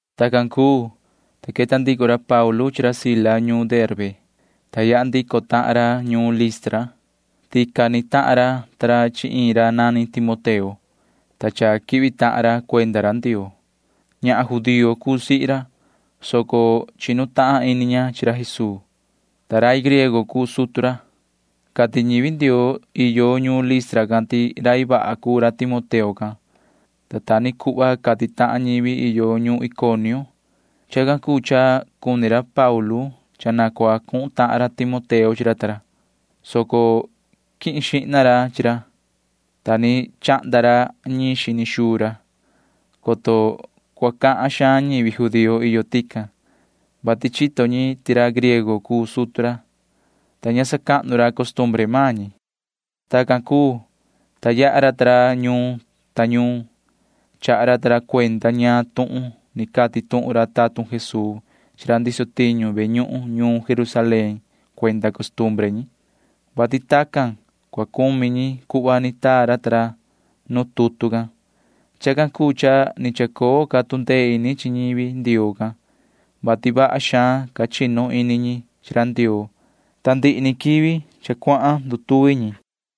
Tacan cuu, ta queta ndico ra Paulu chi ra Sila ñuun Derbe, ta yaha ndico tahan ra ñuun Listra. Tican ni tahan ra ta ra chi iin ra nani Timoteo, ta cha quihvi tahan ra cuenda ra Ndioo. Ñahan judío cuu sihi ra, soco chinu tahan ini ña chi ra Jesuu, ta rai griego cuu sutu ra. Cati ñivi Ndioo iyo ñuun Listra can ti rai vaha cuu ra Timoteo can, ta ta ni cuhva cati tahan ñivi iyo ñuun Iconio. Chacan cuu cha cuni ra Paulu cha na cua cuhun tahan ra Timoteo chi ra ta ra, soco quihin xihna ra chi ra, ta ni chahnda ra ñiin xini xuu ra, coto cua cahan xaan ñivi judío iyo tican, vati chito ñi ti ra griego cuu sutu ra, [ta ña sacahnu ra costumbre maan ñi]. Tacan cuu, ta yaha ra ta ra ñuun ta ñuun. Chaha ra ta ra cuenda ñaan tuhun ni cati tuhun ra tatun Jesuu chi ra ndiso tiñu ve ñuhun ñuun Jerusalén cuenda costumbre ñi, vati tacan cua cumi ñi cuhva ni taa ra ta ra nu tutu can. Chacan cuu cha ni chacoo ca tu ndee ini chi ñivi Ndioo can, vati vaha xaan ca chinu ini ñi chi ra Ndioo, ta ndihi ni quivi cha cuahan ndutuvi ñi.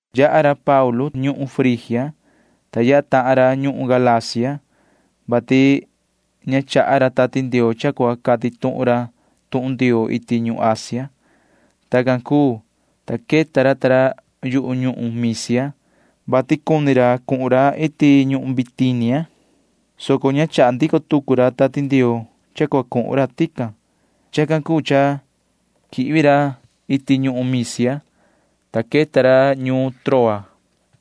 Yaha ra Paulu ta ra ñuhun Frigia, ta yaha tahan ra ñuhun Galacia, vati ña chaha ra Tati Ndioo cha cua cati tuhun ra tuhun Ndioo iti ñuhun Asia. Tacan cuu, ta queta ra ta ra yu ñuhun Misia, vati cuni ra cuhun ra iti ñuhun Bitinia, soco ña chaha ndico tucu ra Tati Ndioo cha cua cuhun ra tican. Chacan cuu cha quihvi ra iti ñuhun Misia, ta queta ra ñuun Troa.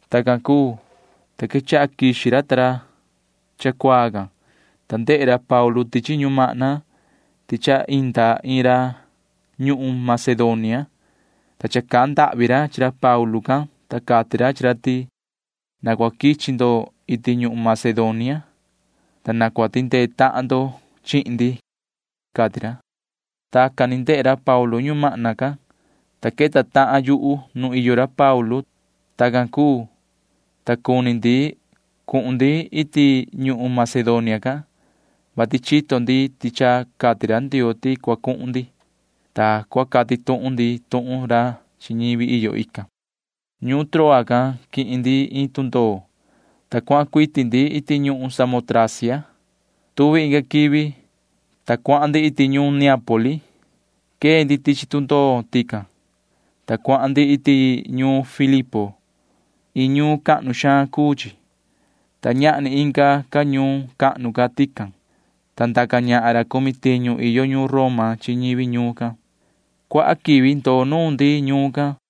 Tacan cuu, ta quechaha quixi ra ta ra cha cuaa can, ta ndehe ra Paulu tichi ñumahna ti cha inda iin ra ñuhun Macedonia, ta cha cahan ndahvi ra chi ra Paulu can, ta cati ra chi ra ti: ―Na cua quichi ndo iti ñuhun Macedonia, ta na cua tindee tahan ndo chihin ndi ―cati ra. Tacan ni ndehe ra Paulu ñumahna can, [ta queta tahan yuhu nu iyo ra Paulu ta ra]. Tacan cuu, ta cuni ndi cuhun ndi iti ñuhun Macedonia can, vati chito ndi ti cha cati ra Ndioo ti cua cuhun ndi, ta cua cati tuhun ndi tuhun ra chi ñivi iyo ican. Ñuun Troa can quihin ndi iin tundoo, ta cuahan cuiti ndi iti ñuhun Samotracia. Tuvi inga quivi, ta cuahan ndi iti ñuun Neápoli. Quee ndi tichi tundoo tican, ta cuahan ndi iti ñuun Filipo. Iin ñuun cahnu xaan cuu chi, ta ñahni inga ca ñuun cahnu ca tican, ta ndaca ñahan ra cumi tiñu iyo ñuun Roma chi ñivi ñuun can. Cuaha quivi ndoo nuun ndi ñuun can.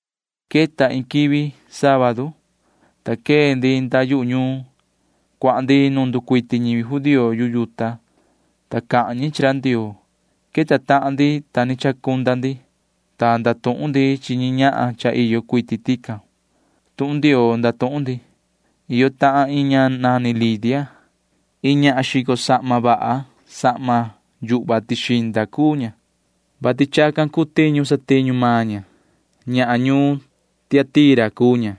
Queta iin quivi sábadu, ta quee ndi nda yu ñuun. Cuahan ndi nu nducuiti ñivi judío yu yuta, ta cahan ñi chi ra Ndioo. Queta tahan ndi, ta ni chacunda ndi, ta ndatuhun ndi chi ñi ñahan cha iyo cuiti tican. Tuhun Ndioo ndatuhun ndi. Iyo tahan iin ña nani Lidia. Iin ñahan xico sahma vaha sahma yuhva tixinda cuu ña, vati chacan cuu tiñu satiñu maan ña. Ñahan ñuun Tiatira cuu ña,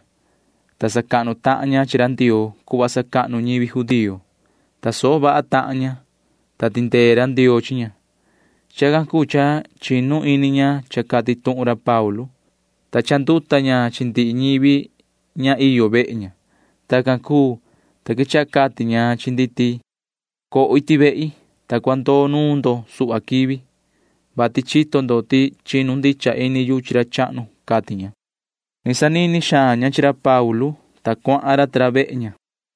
ta sacahnu tahan ña chi ra Ndioo cuhva sacahnu ñivi judío. Tasoho vaha tahan ña, ta tindee ra Ndioo chi ña. Chacan cuu cha chinu ini ña cha cati tuhun ra Paulu, ta cha chanduta ña chi ndihi ñivi ña iyo vehe ña. Tacan cuu, ta quechaha cati ña chi ndi ti: ―Coho iti vehi, ta cua ndoo nuun ndo suhva quivi, vati chito ndo ti chinu ndicha ini yu chi ra chahnu ―cati ña. Ni sanini xaan ña chi ra Paulu ta ra, ta cuahan ra ta ra vehe ña.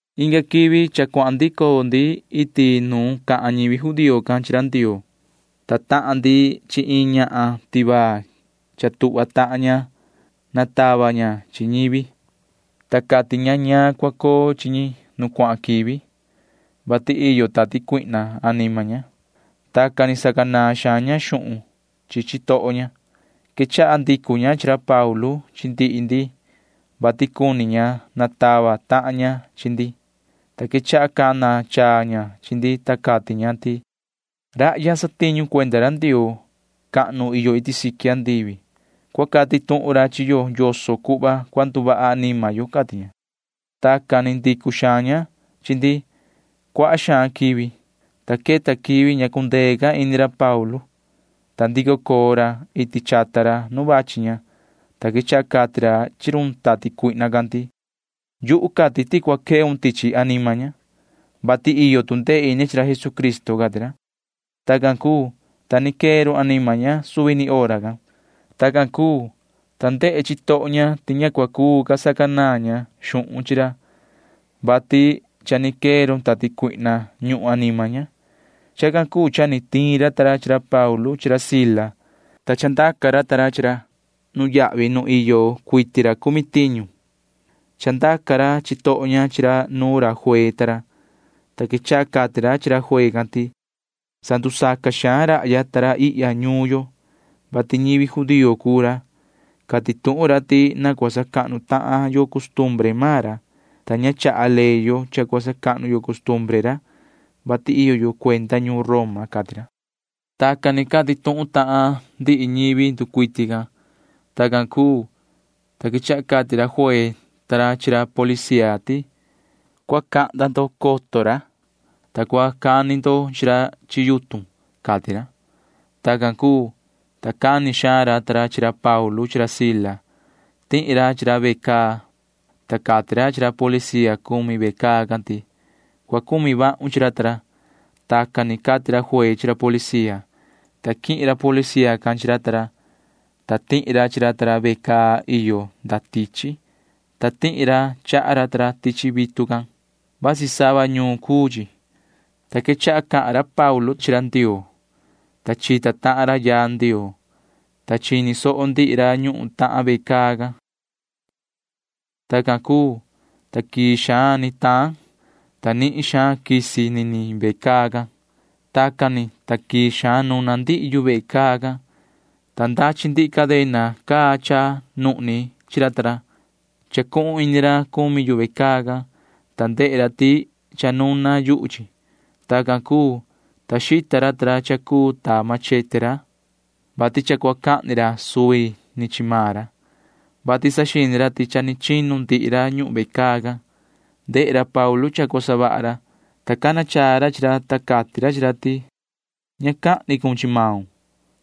Inga quivi cha cuahan ndico ndi iti nu cahan ñivi judío can chi ra Ndioo, ta tahan ndi chi iin ñahan tivaa. Cha tuhva tahan ña natava ña chi ñivi, ta cati ña ñaan cua coo chi ñi nu cuahan quivi, vati iyo tati cuihna anima ña. Tacan ni sacanaan xaan ña xuhun chi chitoho ña. Quechaha ndicu ña chi ra Paulu chi ndihi ndi, vati cuni ña natava tahan ña chi ndi, ta quechaha cana chaa ña chi ndi, ta cati ña ti: ―Rahya satiñu ra cuenda ra Ndioo cahnu iyo iti siqui. Cua cati tuhun ra chi yo yoso cuhva cua nduvaha anima yo ―cati ña. Tacan ni ndicu xaan ña chi ndi cuaha xaan quivi, ta queta quivi ña cundee ca ini ra Paulu, ta ndico coo ra iti chata ra nu vachi ña, ta quechaha cati ra chi run tati cuihna can ti: ―Yuhu cati ti cua queun tichi anima ña, vati iyo tu ndee ini chi ra Jesucristo ―cati ra. Tacan cuu, ta ni quee run anima ña suvi ni hora can. Tacan cuu, ta ndehe chitoho ña ti ña cua cuu ca sacanaan ña xuhun chi ra, vati cha ni quee run tati cuihna ñuhun anima ña. Chacan cuu cha ni tiin ra ta ra chi ra Paulu chi ra Sila, ta chandaca ra chi ra nuyahvi nu iyo cuiti ra cumi tiñu. Chandaca ra chitoho ña chi ra nuun ra juee ta ra, ta quechaha cati ra chi ra juee can ti: ―Sandusaca xaan rahya ta ra ihya ñuun yo, vati ñivi judío cuu ra. Cati tuhun ra ti na cua sacahnu tahan yo costumbre maan ra, ta ña chaha ley yo cha cua sacahnu yo costumbre ra, vati iyo yo cuenda ñuun Roma ―cati ra. Tacan ni cati tuhun tahan ndihi ñivi nducuiti ican. Tacan cuu, ta quechaha cati ra juee ta ra chi ra policía ti: ―Cua cahnda ndo coton ra, ta cua cani ndo chi ra chi yutun ―cati ra. Tacan cuu, ta cani xaan ra ta ra chi ra Paulu chi ra Sila. Tihi ra chi ra ve caa, ta cati ra chi ra policía cumi ve caa can ti: ―Cua cumi vahun chi ra ta ra. Tacan ni cati ra juee chi ra policía, ta quihin ra policía can chi ra ta ra, ta tihi ra chi ra ta ra ve caa iyo nda tichi, ta tihi ra chaha ra ta ra tichi vitu can. Vasi sava ñuun cuu chi, ta quechaha cahan ra Paulu ta ra chi ra Ndioo, ta chita tahan ra yaa Ndioo, ta chini soho ndihi ra ñuhun tahan ve caa can. Tacan cuu, ta quii xaan ni taan, ta nihin xaan quisi niniin ve caa can. Tacan ni, ta quii xaan nuna ndihi yu vehe caa can, ta ndachi ndihi cadena caa chacunuhni chi ra ta ra. Chacuhun ini ra cumi yu ve caa can, ta ndehe ra ti cha nuna yuhu chi. Tacan cuu, ta xita ra cha cuu ta machete ra, vati cha cua cahni ra suvi ni chi maan ra, vati saxini ra ti cha ni chinu ndihi ra ñuhun ve caa can. Ndehe ra Paulu cha cua savaha ra, ta cana chaa ra chi ra, ta cati ra chi ra ti: ―Ña cahni cun chi maun,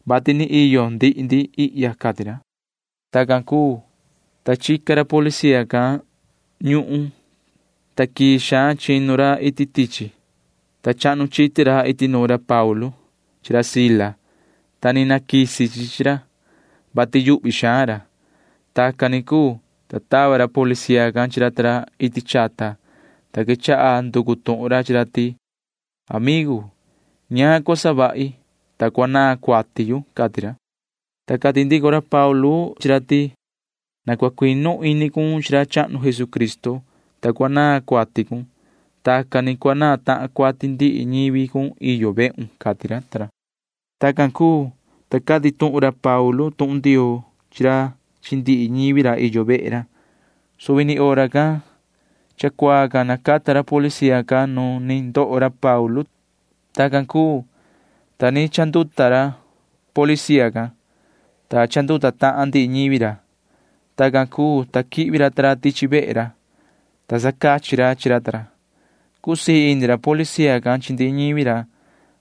vati ni iyo ndihi ndi ihya ―cati ra. Tacan cuu, ta chica ra policía can ñuhun, ta quii xaan chinu ra iti tichi, ta chahnu chiti ra iti nuun ra Paulu chi ra Sila, ta ni naquisi chi chi ra, vati yuhvi xaan ra. Tacan ni cuu, ta tava ra policía can chi ra ta ra iti chata, ta quechaha nducu tuhun ra chi ra ti: ―Amigu, ¿ñaan cua savahi, ta cua naan cuati yu? ―cati ra. Ta cati ndico ra Paulu ta ra chi ra ti: ―Na cua cuinu ini cun chi ra chahnu Jesucristo, ta cua naan cuati cun. Tacan ni cua naan tahan cuati ndihi ñivi cun iyo vehun ―cati ra ta ra. Tacan cuu, ta cati tuhun ra Paulu ta ra tuhun Ndioo chi ra chi ndihi ñivi ra iyo vehe ra. Suvi ni hora can cha cuaa can nacata ra policía can nu ni ndoho ra Paulu ta ra. Tacan cuu, ta ni chanduta ra policía can, ta chanduta tahan ndihi ñivi ra. Tacan cuu, ta quihvi ra ta ra tichi vehe ra, ta sacachi ra chi ra ta ra. Cusii ini ra policía can chi ndihi ñivi ra,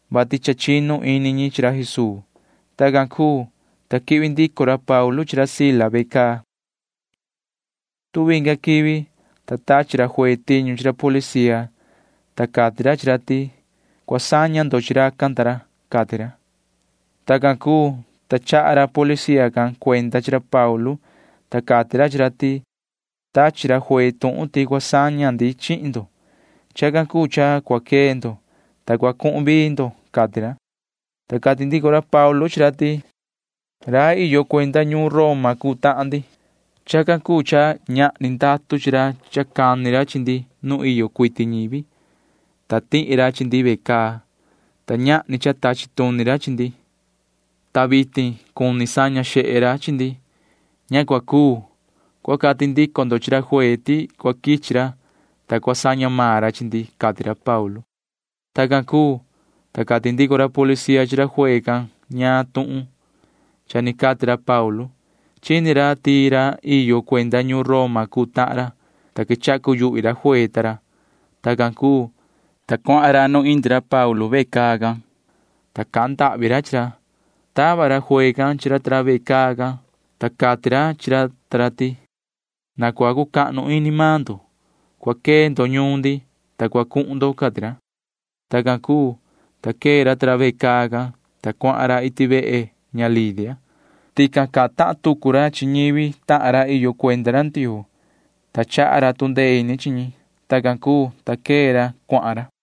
vati cha chinu ini ñi chi ra Jesuu. [Tacan cuu, ta quihvi ndico ra Paulu chi ra Sila ve caa.] Tuvi inga quivi, ta tachi ra juee tiñu chi ra policía, ta cati ra chi ra ti: ―Cua saña ndo chi racan ta ra ―cati ra. Tacan cuu, ta chaha ra policía can cuenda chi ra Paulu, ta cati ra chi ra ti: ―Tachi ra juee tuhun ti cua saña ndi chihin ndo. Chacan cuu cha cua quee ndo, ta cua cuhun vii ndo ―cati ra. Ta cati ndico ra Paulu chi ra ti: ―Rai iyo cuenda ñuun Roma cuu tahan ndi. Chacan cuu cha ñahni ndatu chi ra cha cani ra chi ndi nu iyo cuiti ñivi, ta tihi ra chi ndi ve caa, ta ñahni cha tachi tuni ra chi ndi, ta vitin cuni saña xehe ra chi ndi. Ña cua cuu. Cua cati ndico ndo chi ra juee ti cua quichi ra, ta cua saña maan ra chi ndi ―cati ra Paulu. Tacan cuu, ta cati ndico ra policía chi ra juee can ñaan tuhun cha ni cati ra Paulu. Chini ra ti ra iyo cuenda ñuun Roma cuu tahan ra, ta quechaha cuyuhvi ra juee ta ra. Tacan cuu, ta cuahan ra nu indi ra Paulu ta ra ve caa can, ta cahan ndahvi ra chi ra. Tava ra juee can chi ra ta ra ve caa can, ta cati ra chi ra ti: ―Na cua cucahnu ini maan ndo. Cua quee ndo ñuun ndi, ta cua cuhun ndo ―cati ra. Tacan cuu, ta quee ra ta ra ve caa can, ta cuahan ra iti vehe ña Lidia. Tican cahan tahan tucu ra chi ñivi tahan ra iyo cuenda ra Ndioo, ta chaha ra tu ndee ini chi ñi. Tacan cuu, ta quee ra cuahan ra.